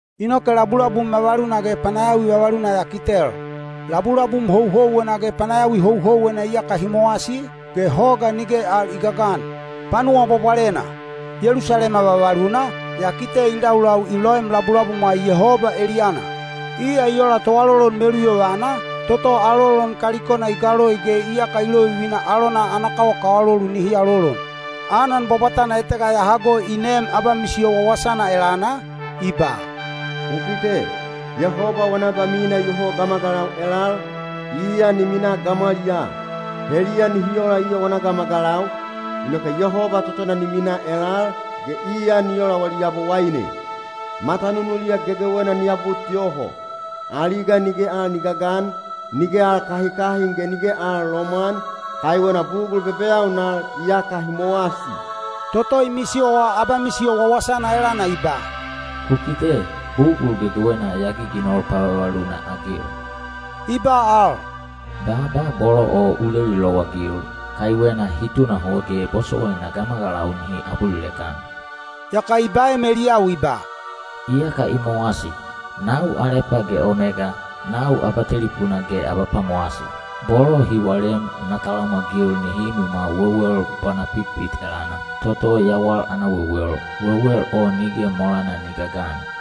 Inoke labulabum vavaluna ge panayawi vavaluna ya kitel. Labulabum houhouwena ge panayawi houhouwena iyaka hi mowasi, ge hoga nige al i gagan. Panuwa Bwabwalena, Yelusalema vavaluna, ya kite i laulau i loem labulabumwa Yehoba eliyana. Iya i ola toalolon meluyovana, toto alolon kalikona i galoi ge iyaka i lovivina alona ana kawakawalolu nihi alolon. Anan bwabwatana etega ya hago i neem abamisiyo wawasana elana, i ba, “Ku kite! Yehoba wana abamina iyoho gamagalau elal, iya ni minaa gamwaliyaa. Heliya nihi ola iya wana gamagalau, inoke Yehoba totona ni miminaa elal, ge iya ni ola wali Yabowaine. Matanunuliya gegewena ni abut yoho. Aliga nige al ni gagan, nige al kahikahin ge nige al lomwan, kaiwena bugul bebeyaunal iyaka hi mowasi.” Toto i misiyowa abamisiyo wawasana elana i ba, “Ku kite! Bugul gegewena ya giginol pavavaluna-agil!” I ba al, “Baaba bolo o u leli lowagil, kaiwena hi tunahot ge bosowaina gamagalau nihi abulilek-an.” Yaka i baem eliyau i ba, “Iyaka i mowasi. Nau Alepa ge Omega, nau Abatelipuna ge Abapwamowasi. Bolo hi walem na talamwagil nihi imwimwa wewel bwanapitpit elana, toto yawal ana wewel, wewel o nige molana ni gagan.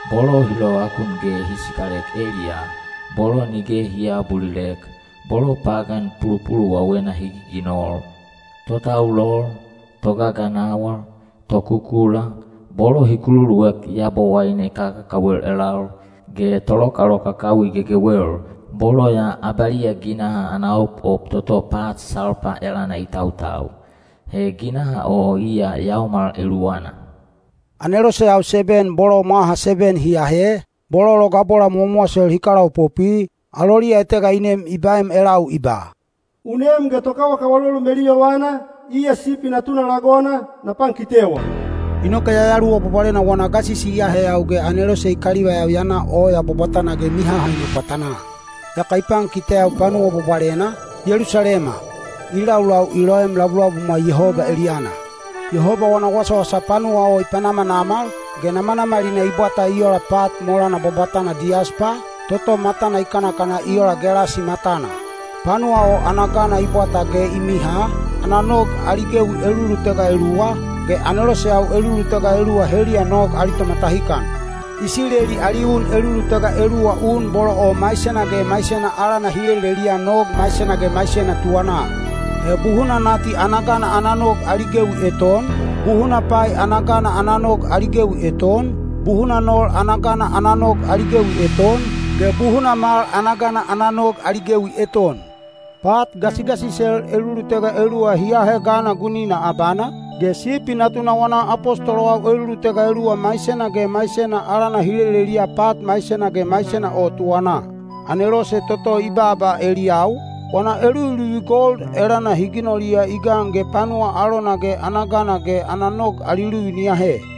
Bolo hi lovakun ge hi sikalek eliyaa, bolo nige hi aabulilek, bolo pagan pulupuluwawena hi giginol, totaulol, togaganawal, tokukula, bolo hi kululuek yabowaine kakakawel elal, ge tolokalokakawi gegewel, bolo ya abaliya ginaha ana opop toto pat salpa elana i tautau. He ginaha o iya yaomal eluwana.” Aneloseyau seben bolo mwaha seben hi ahe, bolo logabola mowamowasel hi kalaopopwi, aloliya etega i nem i baem elau i ba, “U nem ge tokawakawalolu meluyovana, iya Sipi Natuna lagona, na pankitewa.” Inoke Yayaluwa Bwabwalena wana gasisi i aheyau ge anelose i kalivaiyau ya na oya bwabwatana ge mihahaina pwatanaa. Yaka i pankiteyau Panuwa Bwabwalena, Yelusalema, i laulau i loem labulabumwa Yehoba eliyana. Yehoba wana wasawasa panuwa o i panamanamal, ge namanamalina i bwata i ola pat molana bwabwatana diyaspa, toto matana i kanakana i ola gelasi matana. Panuwa o ana gana i bwata ge i miha, ana nog ali gewi elulutega eluwa, ge aneloseyau elulutega eluwa heliya nog ali tomatahikan. Isileli ali un elulutega eluwa un bolo o maisena ge maisena alana hi leleliya nog maisena ge maisena tuwanaa. He buhuna nati ana gana ana nog ali gewi eton, buhuna pai ana gana ana nog ali gewi eton, buhuna nol ana gana ana nog ali gewi eton, ge buhuna mal ana gana ana nog ali gewi eton. Pat gasigasisel elulutega eluwa hi ahe gana gunina abana, ge Sipi Natuna wana apostolowau elulutega eluwa maisena ge maisena alana hi leleliya pat maisena ge maisena o tuwanaa. Anelose toto i baaba eliyau, wana eluviluvi gold elana hi ginoliya i gan ge panuwa alona ge ana gana ge ana nog ali luvi ni ahe.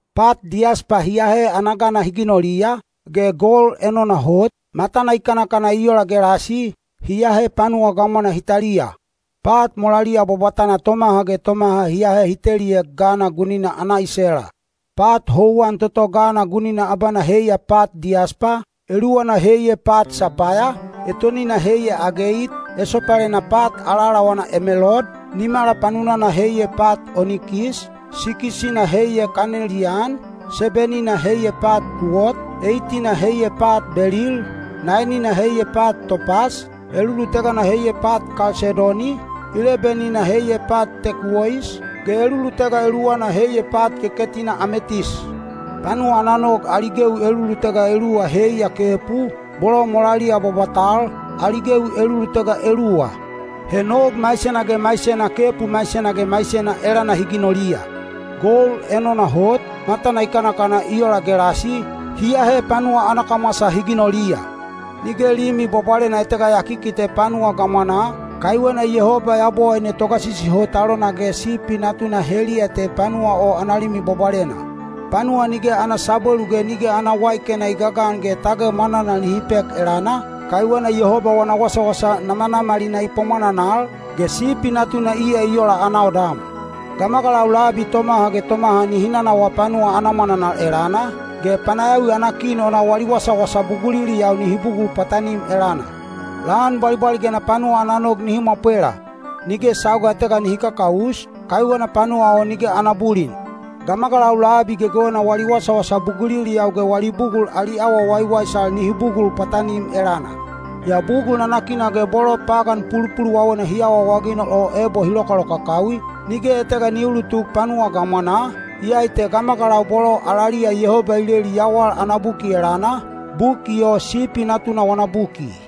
Pat diyaspa hi ahe ana gana hi ginoliya, ge gold enona hot, matana i kanakana i ola gelasi, hi ahe panuwa gamwana hi taliya. Pat molaliya bwabwatal tomaha ge tomaha hi ahe hi teliek gana gunina ana isela. Pat houwan toto gana gunina abana heiya pat diyaspa, eluwana heiya pat sapaya, etonina heiya ageit, esopalena pat alaalawana emelold, nimala panunana heiya pat onikis, sikis-ina heiya kaneliyan, seben-ina heiya pat kuwot, eit-ina heiya pat belil, naen-ina heiya pat topas, elulutegana heiya pat kalsedoni, leben-ina heiya pat tekuwois, ge elulutega eluwana heiya pat keketina ametis. Panuwa ana nog ali gewi elulutega eluwa heiya kepu, bolo molaliya bwabwatal, ali gewi elulutega eluwa. He nog maisena ge maisena kepu maisena ge maisena elana hi ginoliya. Gold enona hot, matana i kanakana i ola gelasi, hi ahe panuwa ana kamwasa hi ginoliya. Nige limi bwabwalena etega ya kikite panuwa gamwanaa, kaiwena Yehoba Yabowaine Togasisi Hot alona ge Sipi Natuna heliya te panuwa o ana limi bwabwalena. Panuwa nige ana sabwelu ge nige ana waikena i gagan ge tage mwananal nihi pek elana, kaiwena Yehoba wana wasawasa namanamalina i pwamwananal, ge Sipi Natuna iya i ola ana odam. Gamagalau labi tomaha ge tomaha nihi nanawaa panuwa ana mwananal elana, ge panayawi ana kin ona wali wasawasa buguliliyau nihi bugul pwatanim elana. Lan bwalibwaligena panuwa ana nog nihi mwapwela. Nige sauga etega nihi kakaus, kaiwena panuwa o nige ana bulin. Gamagalau labi gegewena wali wasawasa buguliliyau ge wali bugul ali awa waiwaisal nihi bugul pwatanim elana. Yaa bugul nanakina ge bolo pagan pulupuluwawena hi awaawaginol o ebo hi lokalokakawi, nige etega ni uulutuk panuwa gamwanaa, iyai te gamagalau bolo alaliya Yehoba i leli yawal ana buki elana, buki o Sipi Natuna wana buki.